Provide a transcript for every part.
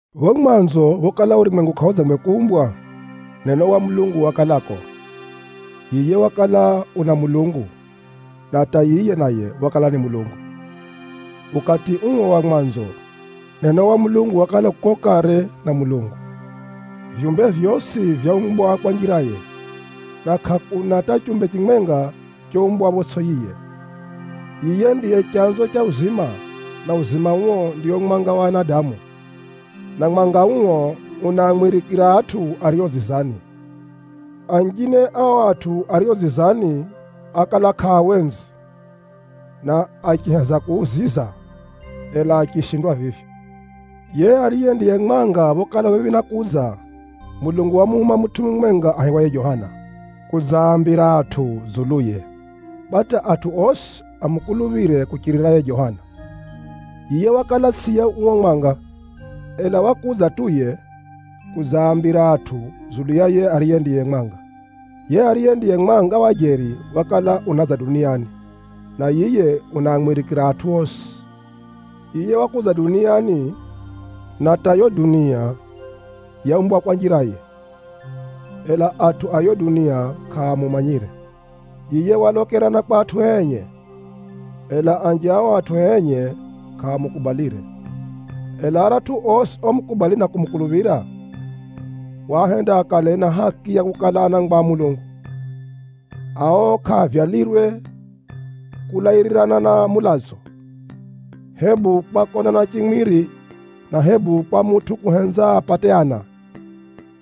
Phapho mwanzo phokala urumwengu kʼaudzangwe kuumbwa, Neno wa Mulungu wakalako. Yiye wakala u na Mulungu, na hata yiye naye wakala ni Mulungu. Ukati uo wa mwanzo, Neno wa Mulungu wakala u kuko kare na Mulungu. Vyumbe vyosi vyaumbwa kwa njiraye, na kʼakuna hata chumbe chimwenga choumbwa photsʼi yiye. Yiye ndiye chanzo cha uzima, na uzima uo ndio mwanga wa anadamu. Na mwanga uo unaamwirikira atʼu ario dzizani. Anjine a o atʼu ario dzizani ákala kʼaawenzi na achiheza kuuziza, ela achishindwa vivyo. Yiye ariye ndiye mwanga phokala u phephi na kudza, Mulungu wamuhuma mutʼu mumwenga aihiwaye Johana, kudzaambira atʼu dzuluye, kwa hata atʼu osi amukuluphire kuchirira yiye Johana. Yiye wakala tsʼiye uo mwanga, ela wakudza tu yiye, kudzaambira atʼu dzulu ya yiye ariye ndiye mwanga. Yiye ariye ndiye mwanga wa jeri wakala unadza duniani, na yiye unaamwirikira atʼu osi. Yiye wakudza duniani, na hata yo dunia yaumbwa kwa njiraye, ela atʼu a yiyo dunia kʼaamumanyire. Yiye walokera na kwa atʼue enye, ela anji a o atʼue enye kʼaamukubalire. Ela aratʼu osi omukubali na kumukuluphira, waahenda akale na haki ya kukala anangwa a Mulungu. Ao kʼaavyalirwe kulairirana na mulatso, hebu kwa konana chimwiri, na hebu kwa mutʼu kuhenza apate ana,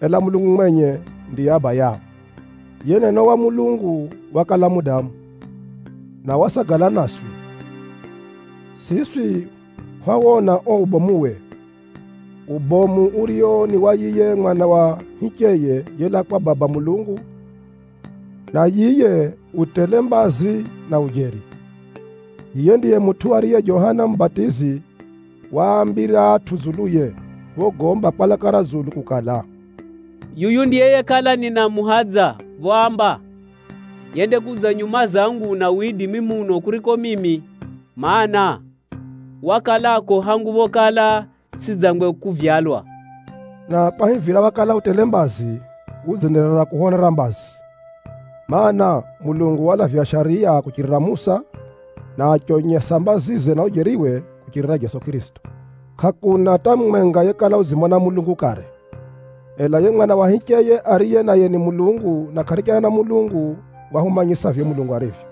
ela Mulungu mwenye ndiye Abayao. Yiye Neno wa Mulungu wakala mudamu, na wasagala naswi. Siswi hwawona uo ubomuwe, ubomu urio ni wa yiye Mwana wa hicheye yelaa kwa Baba Mulungu na yiye u tele mbazi, na ujeri. Yiye ndiye mutʼu ariye Johana Mubatizi waambira atʼu dzuluye phogomba kwa laka ra dzulu kukala, “Yuyu ndiye yekala ninamuhadza phoamba, ‘Yendakudza nyuma zangu una widimi muno kuriko mimi, mana, wakalako hangu phokala tsʼidzangwe kuvyalwa.’” Na kwahivira wakala u tele mbazi, udzenderera kuhwonera mbazi. Maana, Mulungu walavya Shariya kuchirira Musa, na achionyesa mbazize na ujeriwe kuchirira Jeso Kʼirisito. Kʼakuna hata mumwenga yekala udzimona Mulungu kare. Ela yiye Mwana wa hicheye, ariye naye ni Mulungu na kʼarichana na Mulungu, wahumanyisa vivyo Mulungu arivyo.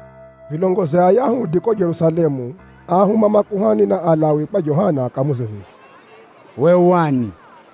Vilongozi a Ayahudi kuko Jerusalemu áahuma makuhani na Alawi kwa Johana akamuuze vivi, “Uwe u ani?”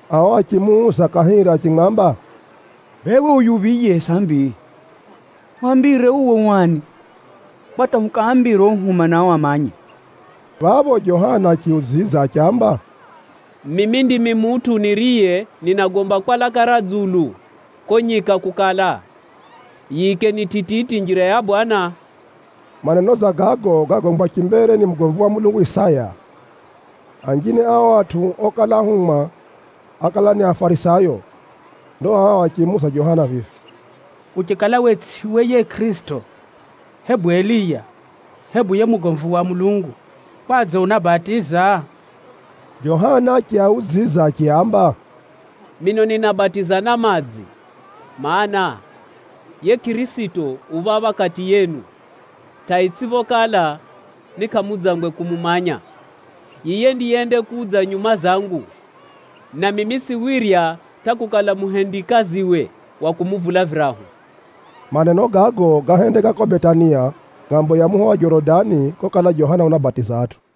Ao achimuuza kahiri achimwamba, “Bee, uwe u yuphiye sambi? Hwambire uwe u ani kwa hata hukaambire ohuhuma nao amanye.” Phapho Johana achiudzidza achiamba, “Mimi ndimi mutʼu niriye ninagomba kwa laka ra dzulu kuko nyika kukala, ‘Yiikeni tititi njira ya Bwana Mulungu.’” Maneno dza gago gágombwa chimbere ni mugomvi wa Mulungu Isaya. Anjine a ao atʼu okala ahumwa, ákala ni Afarisayo. Ndo ao achimuuza Johana vivi, “Uchikala we tsʼiwe yiye Kʼirisito, hebu Eliya, hebu yiye mugomvi wa Mulungu, kwadze unabatiza?” Johana achiaudzidza achiaamba, “Mino ninabatiza na madzi, mana, yiye Kʼirisito u phapha kati yenu, hata itsʼiphokala ni kʼamudzangwe kumumanya. Yiye ndiye yendakudza nyuma zangu, na mimi tsʼiwirya hata kukala muhendikaziwe wa kumuvula virahu.” Maneno gago gáhendeka kuko Betania, ngʼambo ya muho wa Jorodani kokala Johana unabatiza atʼu.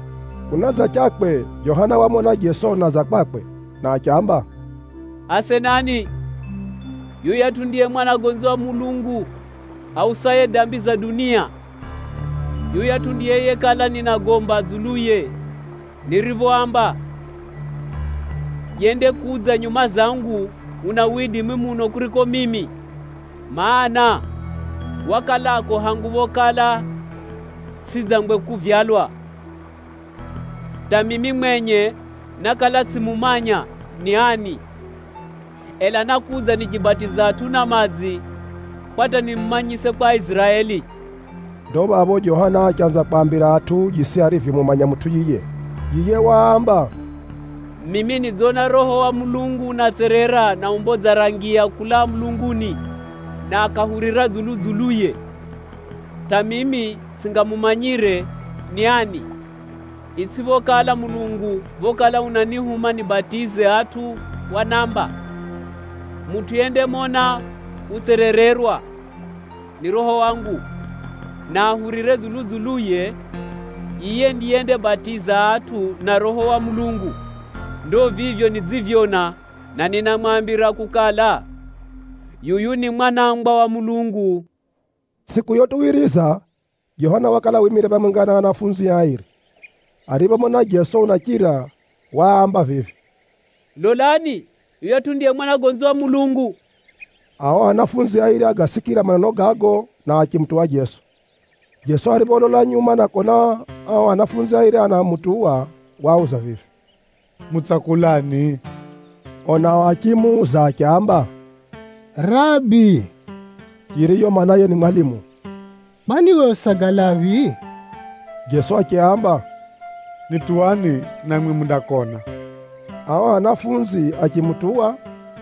Kunadzachakwe, Johana wamona Jeso unadza kwakwe, na achiamba, “Asenani, yuyatʼu ndiye Mwanagonzi wa Mulungu ausaye dambi za dunia! Yuyatʼu ndiye yekala ninagomba dzuluye niriphoamba, ‘Yendakudza nyuma zangu una widimi muno kuriko mimi, mana, wakalako hangu phokala tsʼidzangwe kuvyalwa.’ Hata mimi mwenye nákala tsʼimumanya ni ani, ela nákudza nichibatiza atʼu na madzi, kwa hata nimumanyise kwa Aiziraeli.” Ndo phapho Johana achanza kwaambira atʼu jisi arivyomumanya mutʼu yiye. Yiye waamba, “Mimi nidzona Roho wa Mulungu unatserera na umbo dza ra ngiya kulaa mulunguni, na akahurira dzulu-dzuluye. Hata mimi tsʼingamumanyire ni ani, itsʼiphokala Mulungu phokala unanihuma nibatize atʼu wanamba, ‘Mutʼu yendamona utserererwa ni Roho wangu, na ahurire dzulu-dzuluye, yiye ndiye yendaabatiza atʼu na Roho wa Mulungu.’ Ndo vivyo nidzivyona, na ninamwambira kukala, yuyu ni Mwanangwa wa Mulungu.” Tsʼiku yotuwiriza, Johana wakala wimire phamwenga na anafunzie airi. Ariphomona Jeso unachira, waamba vivi, “Lolani! Yuyatʼu ndiye Mwanagonzi wa Mulungu.” Ao ahumwa airi ágasikira maneno gago, na achimutuwa Jeso. Jeso aripholola nyuma na kona ao ahumwa airi anamutuwa, waauza vivi, “Mutsakulani?” Ao nao achimuuza achiamba, “Rabi” (yiriyo maanaye ni mwalimu), “Kwani uwe usagalaphi?” Jeso achiaamba, “Nituwani namwi mundakona.” Ao anafunzi achimutuwa,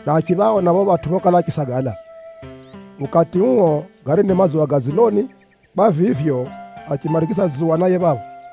na achiphaona phapho phatʼu phokala achisagala. Ukati uo, gari ni madzuwa ga dziloni, kwa vivyo, achimarigiza dzuwa naye phapho.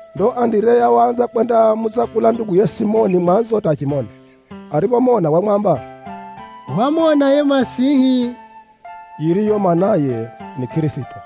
Ndo Andireya waanza kwendamutsakula nduguye Simoni mwanzo hata achimona. Ariphomona wamwamba, “Hwamona yiye Masihi” (yiriyo maanaye ni Kʼirisito).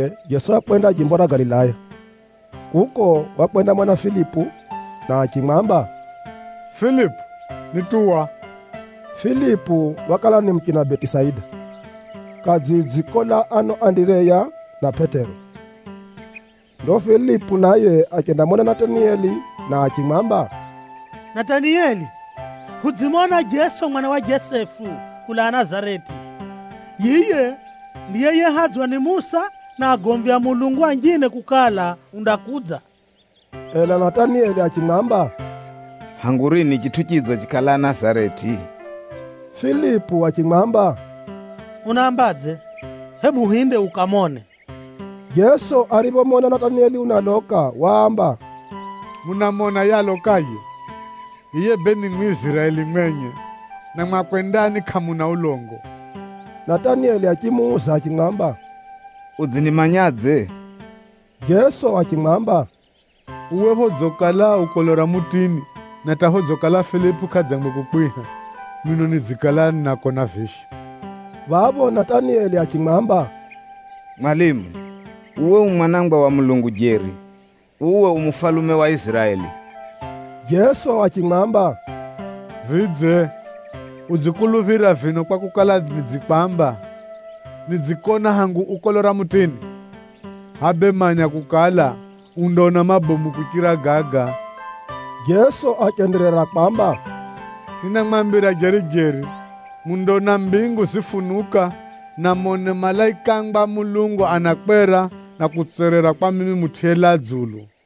Kunadzachakwe, Jeso wakwenda jimbo ra Galilaya. Kuko, wakwendamona Filipu na achimwamba, “Filipu, nituwa.” Filipu wakala ni muchina Betisaida, kadzidzi kolaa ano Andireya na Pʼetero. Ndo Filipu naye achendamona Natanieli na achimwamba, “Natanieli, hudzimona Jeso mwana wa Jesefu, kulaa Nazareti. Yiye ndiye yehadzwa ni Musa na agomvi a Mulungu anjine kukala undakudza.” Ela Natanieli achimwamba, “Hangu rini chitʼu chidzo chikalaa Nazareti?” Filipu achimwamba, “Unaambadze? Hebu hinde ukamone.” Jeso ariphomona Natanieli unaloka, waamba, “Munamona yiye alokaye! Yiye bee ni Mwiziraeli mwenye, na mwakwe ndani kʼamuna ulongo.” Natanieli achimuuza achimwamba, “Udzinimanyadze?” Jeso achimwamba, “Uwe phodzikala u kolo ra mutini, na hata phodzikala Filipu kʼadzangwe kukwiha, mino nidzikala ninakona vivyo.” Phapho Natanieli achimwamba, “Mwalimu, uwe u Mwanangwa wa Mulungu jeri. Uwe u Mufalume wa Iziraeli!” Jeso achimwamba, “Vidze, udzikuluphira vino kwakukala, nidzikwamba, nidzikona hangu u kolo ra mutini? Hʼaya bee manya kukala, undaona mabomu kuchira gaga.” Jeso achenderera kwamba, “Ninamwambira jeri-jeri, mundaona mbingu zifunuka, na mone malaikangwa a Mulungu anakwera, na kutserera kwa mimi Mutʼu yelaa dzulu.”